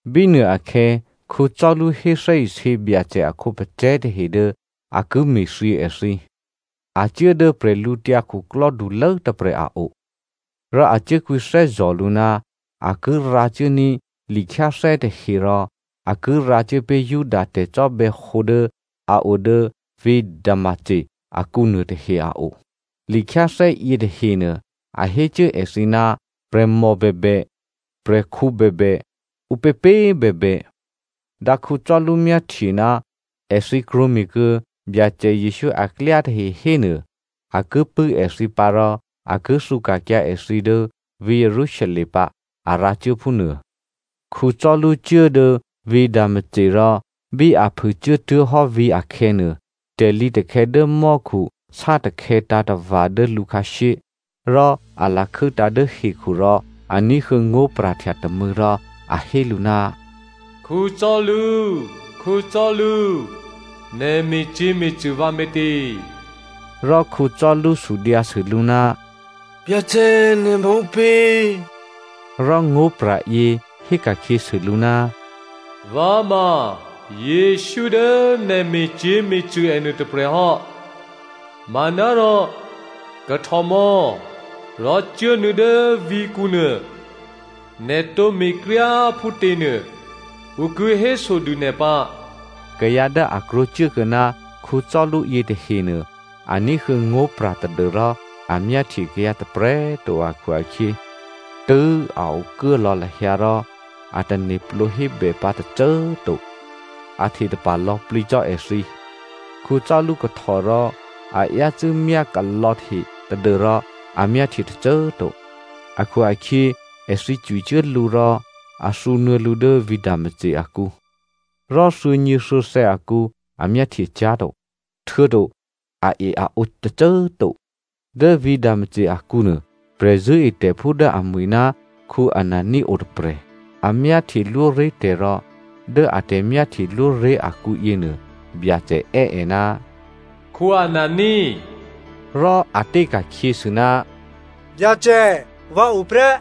Bínuôakhè̌ Saulu hé thè́isě Byacè a khǒpacè̤̌ tahe dố a ki me̤thyě èthǐ. A cuố dố bwídukhulố tôprè̤ a o rò a cuốkwǐthè́zò̤ lǔ ná a ki rǎcuốní̤ likhyáthè́ tahe rò a ki rǎcuố pé̤ Juda tè̤cò́bè̌hǒ dố a o dố vǐ̤ Damasco akǔ nuôtahe a o. Likhyáthè́ yětahenuô, a hé cuố èthǐ ná prè̤mò bèbè, prè̤khǔ bèbè, ǔpěpě꤮ bèbè, dǎ Saulu myáhtye ná èthǐ krwǒme̤kuô̌ Byacè Jesǔ aklyá tahe hénuô, a ki pṳ̂́ èthǐ pǎ rò a ki thǔka̤kyǎ èthǐ dố vǐ̤ Jerusalem pǎ, a rǎcuố phúnuô. Saulu cuố dố vǐ̤ Damasco rò bí a phû cuốtuố̤hò́ vǐ̤ akhè̌nuô, tè̤lǐtakhè̌ dố mò́khu sátakhè̌ tǎ̤tava̤ dố lǔ khǎshyé. Rò a lakhû́tǎ̤ dố hekhu rò a ní̤huô̌ ngó̤pra̤htya tômû̌ rò a hé lǔ, “Saulu, Saulu, nè̤ me̤cyě̤me̤cṳ̂ vǎ me̤tě?” Rò Saulu sudyǎsû lǔ, “Byacè꤮ nè̤ ma ǔpě?” Rò ngó̤pra̤ yě héka̤khyěsû lǔ, “Vǎ ma Jesǔ dố nè̤ me̤cyě̤me̤cṳ̂ è nuôtôprè̤ hò́. Manárò kahtòmò̌ rò cuốnuô̌ dố vǐ̤kǔ nuô. Nè̤ tǒ me̤kryá꤮ phútěnuô, ǔ ki hésodû nè̤ pǎ.” Kayǎ dố a krwǒcuốkuô̌ ná Saulu yětahenuô a ní̤huô̌ ngó̤pra̤ tadû́rò a myáhtye kayǎ tôprè̤꤮ to akhu-akhyě, tṳ̂̌꤮, a okuố lò̌ lahyǎ rò a tane̤plǒ hébè pǎ tôcô꤮ to. A htetapa̤ lò̌plǐ cò́ èthǐ. Saulu kahtò rò a yácû́ myákalò̌hte tadû́rò a myáhtye tôcô꤮ to akhu-akhyě èthǐ cwicuố lǔ rò a thǔnuô̌ lǔ dố vǐ̤ Damasco akǔ. Rò thuô̌nyěthuô̌thè̌ akǔ a myáhtyecyá̤to, htuô̌to ae-aǒ tôcô꤮ to. Dố vǐ̤ Damasco akǔnuô prè̤zṳ̂́etè̤phú dố amwi̤ ná Anania o tôprè̤. A myáhtyelwóré̤ tè̤ rò dố a tè̤myáhtyelwóré̤ akǔyěnuô Byacè è́ è, “Anania!” Rò a té ka̤khyěsû, “Byacè vǎo prè́.”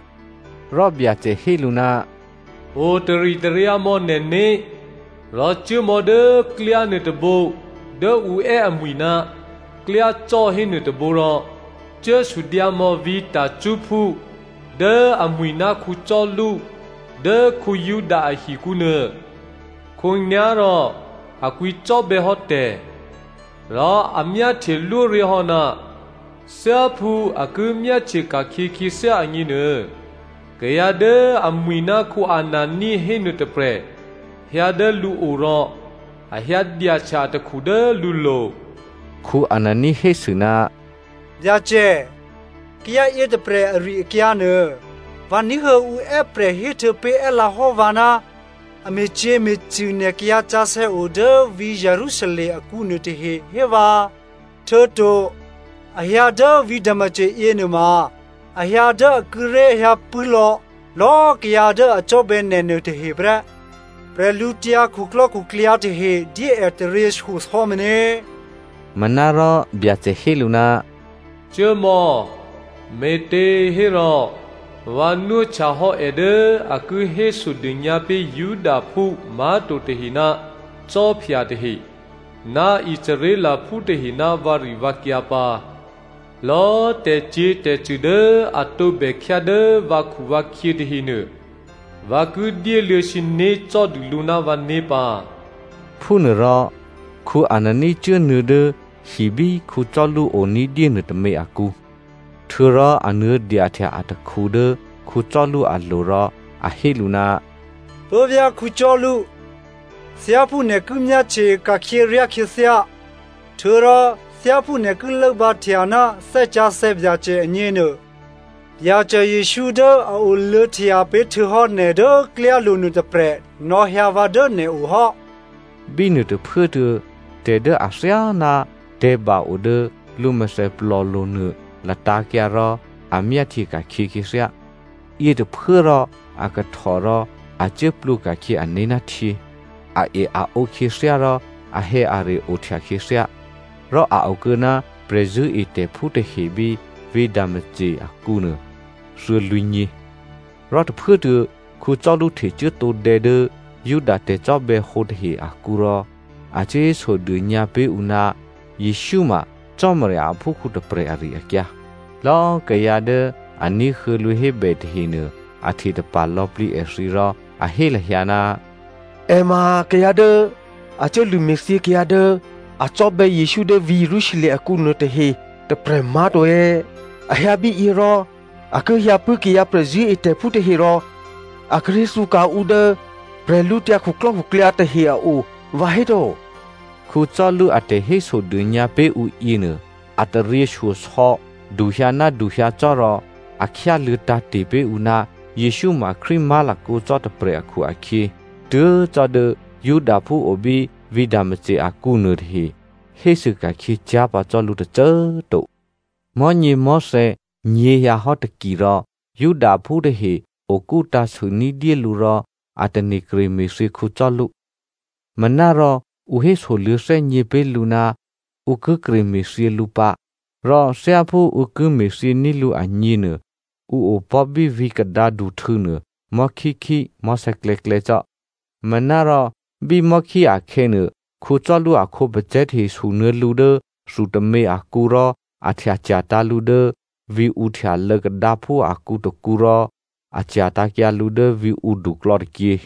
Rò Byacè hé lǔ, “O taritaryǎ mò̌ nè̤né̤ rò cuố mò̌ dố klyá nuôtôbǒ dố ǔ è́ amwi̤ ná klyácò́ hénuô tôbǒ rò cuố sudyǎ mò̌ vǐ̤ Tarsophú dố amwi̤ ná Saulu dố Juda ahikǔ nuô. Khǒnyá̤rò a kwǐcò́bè̌ hò́ tè̤. Rò a myáhtyelwóré̤ hò́, thyáphú a ki myáhtye ka̤khyě khyěthyá agněnuô, kayǎ dố amwi̤ ná Anania hénuô tôprè̤ hyǎ dố lǔo rò a hyǎ dyahtya atakhu dố lǔlo̤.” Anania hésû, “Byacè, kayǎ yětôprè̤ ari-akyǎ nuô, vǎ ní̤huô̌ ǔ è́prè̤ héhtuô̌pé̤ è́lǎ hò́ vǎ, a me̤cyě̤me̤cṳ̂ nè̤ kayǎsǎsè̌ o dố vǐ̤ Jerusalem akǔ nuôtahe, hévǎ. Htuô̌to, a hyǎ dố vǐ̤ Damasco yěnuôma a hyǎ dố a kíré̤ hyǎpṳ̂́ lò̌lò̌꤮ kayǎ dố a cò́bè̌ nè̤ nuôtahe prè́. Bwídukhu tahe dyé è taryěshyosò̌ meně.” Manárò Byacè hé lǔ, “Cuốmò̌, me̤těhérò vǎ nwóhtya hò́ è dố a ki hésodônyǎ pé̤ Judaphú má̤to tahe ná khwí tahe, ná Israelphú tahe ná vǎrivǎkyǎ pǎ. Lò̌꤮ tè̤cyě̤tè̤cṳ̂ dố a tǒbè khyá dố vǎkhuvǎkhyě tahenuô vǎ ki dyéluô̌ sǐné̤ cò́dû lǔ ná vǎné̤ pǎ.” Phúnuôrò Anania cuốnuô̌ dố hi bí Saulu o ní̤dyé nuôtômě akǔ. Htuô̌rò a nuô̌dyahtya atakhu dố Saulu alo̤ rò a hé lǔ, “Puố̤vyá̤ Saulu, thyáphú nè̤ ki myáhtye ka̤khyě ryá khyěthyá, htuô̌rò thyáphú nè̤ ki lốbǎhtya ná Thè́ Sǎsè̌ Byacè agněnuô, Byacè Jesǔ dố a oluô̌htya pé̤ htuô̌hò́ nè̤ dố klyálo̤ nuôtôprè̤, nò̌hyǎ vǎ dố nè̤o hò́.” Bínuô tôphuốtuô̌ tè̤ dố athyáná tè̤̌ba o dố lǔ mèthèplòlo̤ nuô latǎ̤kyǎ rò a myáhtye ka̤khyě khyěthyá. Yětôphuốrò a kahtò rò a cuố plwǒ ka̤khyě ané̤ ná htyě. Ae-aǒ khyěthyá rò ahè̌are ohtya khyěthyá. Rò a okuô̌ ná prè̤zṳ̂́etè̤phú tahe bí vǐ̤ Damasco akǔnuô thuô̌lwǐ̤nyě. Rò tôphuốtuô̌ Saulu htecuố tǒdè̌ dố Juda tè̤cò́bè̌hǒ tahe akǔ rò a cuốhésodônyǎ pé̤ ǔ ná Jesǔ ma Cò́marya aphúkhǔ tôprè̤ ari-akyǎ. Lò̌꤮ kayǎ dố a ní̤huô̌ lǔ hébè tahenuô, a htetapa̤ lò̌plǐ èthǐ rò a hé lahyǎ, “È ma kayǎ dố a cuốlṳ̂ me̤thyě kayǎ dố a cò́bè̌ Jesǔ dố vǐ̤ Jerusalem akǔ nuôtahe tôprè̤ má̤to è̌? A hyǎ bíyě rò a ki hyǎpṳ̂́ kayǎ prè̤zṳ̂́etè̤phú tahe rò a kíré̤ thǔka̤ ǔ dố bwídukhu tahe a o vǎhéto?” Saulu a tè̤hésodônyǎ pé̤ ǔ yěnuô a taryěshyosò̌ duhyǎ ná duhyǎ cò́ rò a khyáluô̌ tǎ̤te̤ pé̤ ǔ ná Jesǔ ma Krístu má̤lakǒ cò́ tôprè̤ akhu-akhyě, tuố̤ cò́ dố Judaphú o bí vǐ̤ Damasco akǔ nuôtahe hésûka̤khyě cyá̤ pǎ cò́ lǔ tôcô꤮ to. Mò̤́nyěmò̤́thè̌ nyěhyǎ hò́ taki rò Judaphú tahe okú tǎ̤sû ní̤dyé lǔ rò a tane̤ kreme̤thyě Saulu. Manárò ǔ hésoluô̌ thè́gně pé̤ lǔ ná ǔ ki kre me̤thyě lǔ pǎ, rò thyáphú ǔ ki me̤thyění̤ lǔ agněnuô ǔ opò̤́ bí vǐ̤ kadǎduhtû̌nuô mò̤́khíkhí mò̤́sè̌klè̌klè̌ cò́. Manárò bí mò̤́khí akhè̌nuô, Saulu a khǒpacè̤̌ tahe sunuô̌ lǔ dố thu tômě akǔ rò a htya cya̤tǎ̤ lǔ dố vǐ̤ǔhtyalô̌ kadǎphú akǔ tôkǔ rò a cya̤tǎ̤kyǎ lǔ dố vǐ̤ǔdu klò̌tôkyě.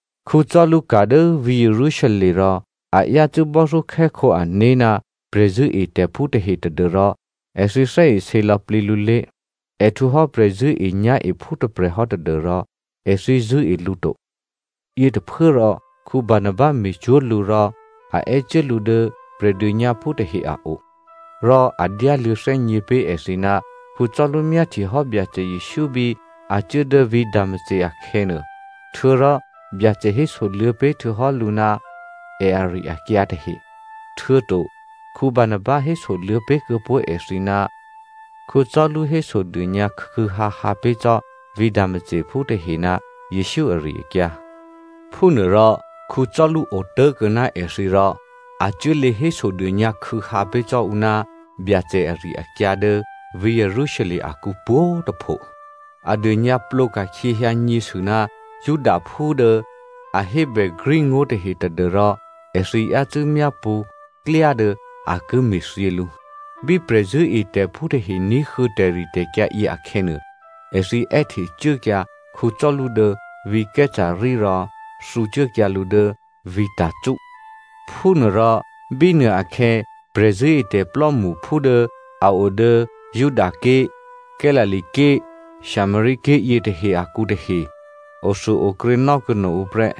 Saulu ka̤ dố vǐ̤ Jerusalem rò a yácû́ bò́thyókhè́khǒ ané̤ ná prè̤zṳ̂́etè̤phú tahe tadû́rò èthǐ thè́isě lò̌plǐ lǔlé̤. È htwǒ hò́ prè̤zṳ̂́enyá̤ephú tôprè̤ hò́ tadû́rò èthǐ zṳ̂́e lǔ to. Yětôphuốrò Barnaba me̤cwó̤ lǔ rò a è́cuố lǔ dố Prè̤dônyǎphú tahe a o. Rò a dyáluô̌ thè́gně pé̤ èthǐ ná Saulu myáhtyehò́ Byacè Jesǔ bí a cuố dố vǐ̤ Damasco akhè̌nuô, htuô̌rò Byacè hésoluô̌ pé̤ htuô̌hò́ lǔ ná è ari-akyǎ tahe. Htuô̌to Barnaba hésoluô̌ pé̤kuô̌ pó̤ èthǐ ná Saulu hésodônyǎ khû̌khû̌hǎhǎ pé̤ cò́ vǐ̤ Damascophú tahe ná Jesǔ ari-akyǎ. Phúnuôrò Saulu otố̤ kuô̌ná èthǐ rò a cuố lě hésodônyǎ khû̌hǎ pé̤ cò́ ǔ ná Byacè ari-akyǎ dố vǐ̤ Jerusalem akǔ pwǒ̤꤮ tôpho. A dônyǎplǒ ka̤khyěhyǎnyě sû ná Helleniaphú tahe tadû́rò èthǐ yácû́ myápṳ̌ klyá dố a ki me̤thyě lǔ. Bí prè̤zṳ̂́etè̤phú tahe ní̤huô̌ tè̤ritè̤kyǎ yě akhè̌nuô, èthǐ è́hte cuốkyǎ Saulu dố vǐ̤ Caesarea rò thǔcuốkyǎ lǔ dố vǐ̤ Tarso. Phúnuôrò bínuôakhè̌ prè̤zṳ̂́etè̤ plò́mṳphú dố a o dố Judaké̤, Galilea ké̤, Samaria ké̤ yětahe akǔ tahe othuôokrě nò́kuô̌ no ǔ prè́.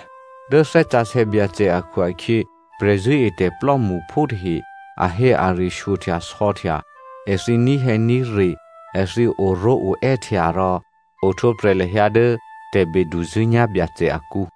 Dố Thè́ Sǎsè̌ Byacè akhu-akhyě prè̤zṳ̂́etè̤ plò́mṳphú tahe ahè̌are shyohtyasò̌htya, èthǐ ní̤hè̌ní̤re, èthǐ oró̤oè́htya rò ohtwǒprè̤ lahyǎ dố tè̤beduzṳ̂́nyá̤ Byacè akǔ.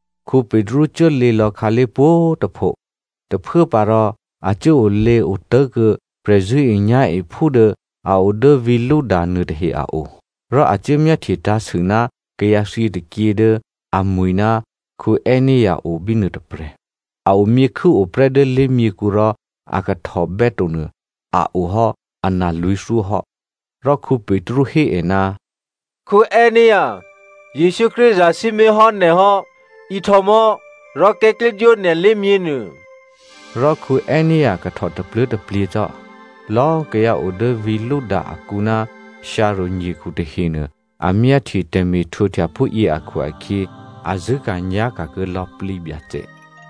Petru cuốlě lò̌ khǎlé̤ pwǒ̤꤮ tôpho. Tôphuốpǎ rò a cuốolěo tố̤kuô̌ prè̤zṳ̂́enyá̤ephú dố a o dố vǐ̤ Lydda nuôtahe a o. Rò a cuố myáhtye tǎ̤sû ná kayǎ thyětôkyě dố amwi̤ ná Aenea o bínuô tôprè̤, a omyěkhû́ oprè́ dố lé̤myěkhu rò a kahtòbè́to nuô a o hò́ analwǐ̤thyó hò́. Rò Petru hé è, “Aenea꤮ Jesǔ Krístu zasǐmé̤hò́ nè̤ hò́. Ihtò mò̌ rò kè̤́klyédwó nè̤ lé̤myěnuô” rò Aenea kahtò tapluố̤taplyě cò́. Lò̌꤮ kayǎ o dố vǐ̤ Lydda akǔ ná Sharòn nyekhu tahenuô a myáhtye tè̤me̤htwǒhtya phúyě akhu-akhyě a zṳ̂́ka̤nyá̤ka̤ kuô̌ lò̌plǐ Byacè.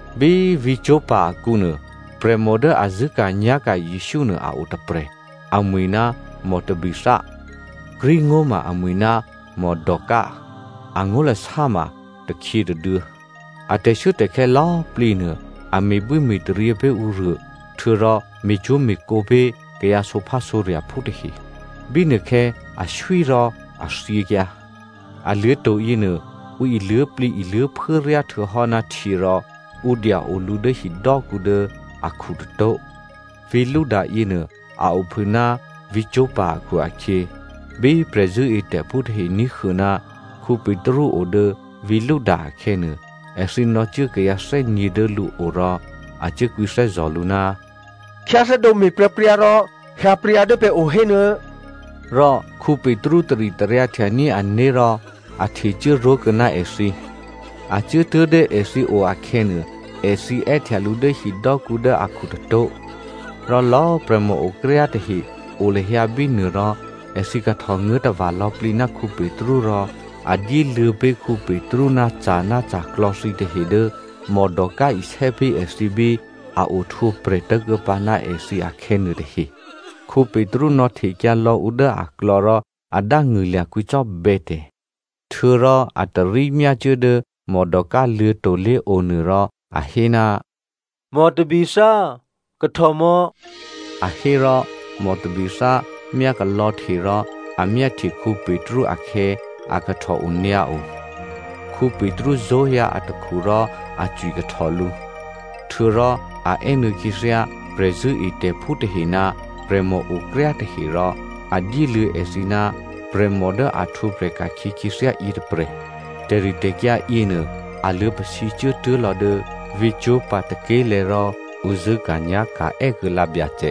Bí vǐ̤ Joppa akǔnuô prè̤mò dố a zṳ̂́ka̤nyá̤ka̤ Jesǔ nuô a o tôprè̤ amwi̤ ná Tabitha (Greek ngó̤ ma amwi̤ ná Dorca, angó̤lasá ma takhyě tôduô̌) a tè̤shuốtè̤khè̌ lò̌꤮ plǐ nuô a me̤bwíme̤taryě pé̤ ǔruô htuô̌rò me̤cwó̤me̤kǒ pé̤ kayǎ sǒphásǒrya̤phú tahe. Bínuôkhè̌ aswí rò a thyěkyǎ. Aluô̤̌to̤ yěnuô, ǔ iluố̤plǐiluố̤phuố ryá htuô̌hò́ ná htyě rò ǔ dya-o lǔ dố hidò́kǔ dố akhu tôtó̤. Vǐ̤ Lydda yěnuô, a ophû ná vǐ̤ Joppa akhu-akhyě, bí prè̤zṳ̂́etè̤phú tahe ní̤huô̌ ná Petru o dố vǐ̤ Lydda akhè̌nuô, èthǐ nò̌cuố kayǎ thè́nyě̤ dố lǔo rò a cuố kwǐthè́zò̤ lǔ, “Khyáthè́dǒ me̤pryǎpryǎ rò hyǎpryǎ dố pè̤ o hénuô̌!” Rò Petru taritaryǎhtyaní̤ ané̤ rò a htecuố ró̤kuô̌ ná èthǐ. A cuốtuố̤ dố èthǐo akhè̌nuô, èthǐ è́htya lǔ dố hidò́kǔ dố akhu tôtó̤. Rò lò̌꤮ prè̤mòokryá tahe o lahyǎ bínuô rò èthǐ kahtò nguố̤ tava̤ lò̌plǐ ná Petru rò a dyéluô̌ pé̤ Petru ná ca̤ ná ca̤klò̌ thǐtahe dố Dorca isè́ pé̤ èthǐ bí a ohtwǒprè̤ tố̤kuô̌pǎ ná èthǐ akhè̌ nuôtahe. Petru nò̌htekyǎ lò̌ ǔ dố aklò̌ rò a dángṳ̂lya̤ kwǐcò́bè̌ tè̤. Htuô̌rò a tarí myácuố dố Dorca luô̤̌to̤ lé̤onuô rò a hé, “Tabitha꤮ kahtòmò̌” a hé rò Tabitha myákalò̌hte rò a myáhtye Petru akhè̌ a kahtò onyǎo. Petru zó̤hyǎ atakhu rò a cwikahtò lǔ. Htuô̌rò a è́nuô̌ khyěthyá prè̤zṳ̂́etè̤phú tahe ná prè̤mòokryá tahe rò a dyéluô̌ èthǐ ná prè̤mò dố a htwǒprè̤ ka̤khyě khyěthyá yětôprè̤. Tè̤ritè̤kyǎ yěnuô, a luô̌pasǐcuố tuố̤ lò̌ dố vǐ̤ Joppa tôké̤lè̤̌ rò ǔ zṳ̂́ka̤nyá̤ka̤ è́kuô̌lǎ Byacè.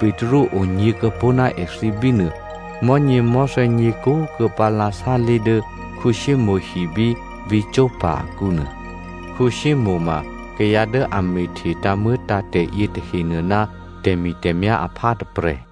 Petru onyě̤kuô̌pó̤ ná èthǐ bínuô mò̤́nyěmò̤́thè̌ nyě̤kúkuô̌pǎ lǎ sálé̤ dố Simonè hi bí vǐ̤ Joppa akǔ nuô. Simonè ma kayǎ dố a me̤hte tǎ̤muô̌tǎ̤tè̤ yětahenuô ná tè̤mi̤tè̤myá̤ aphá tôprè̤.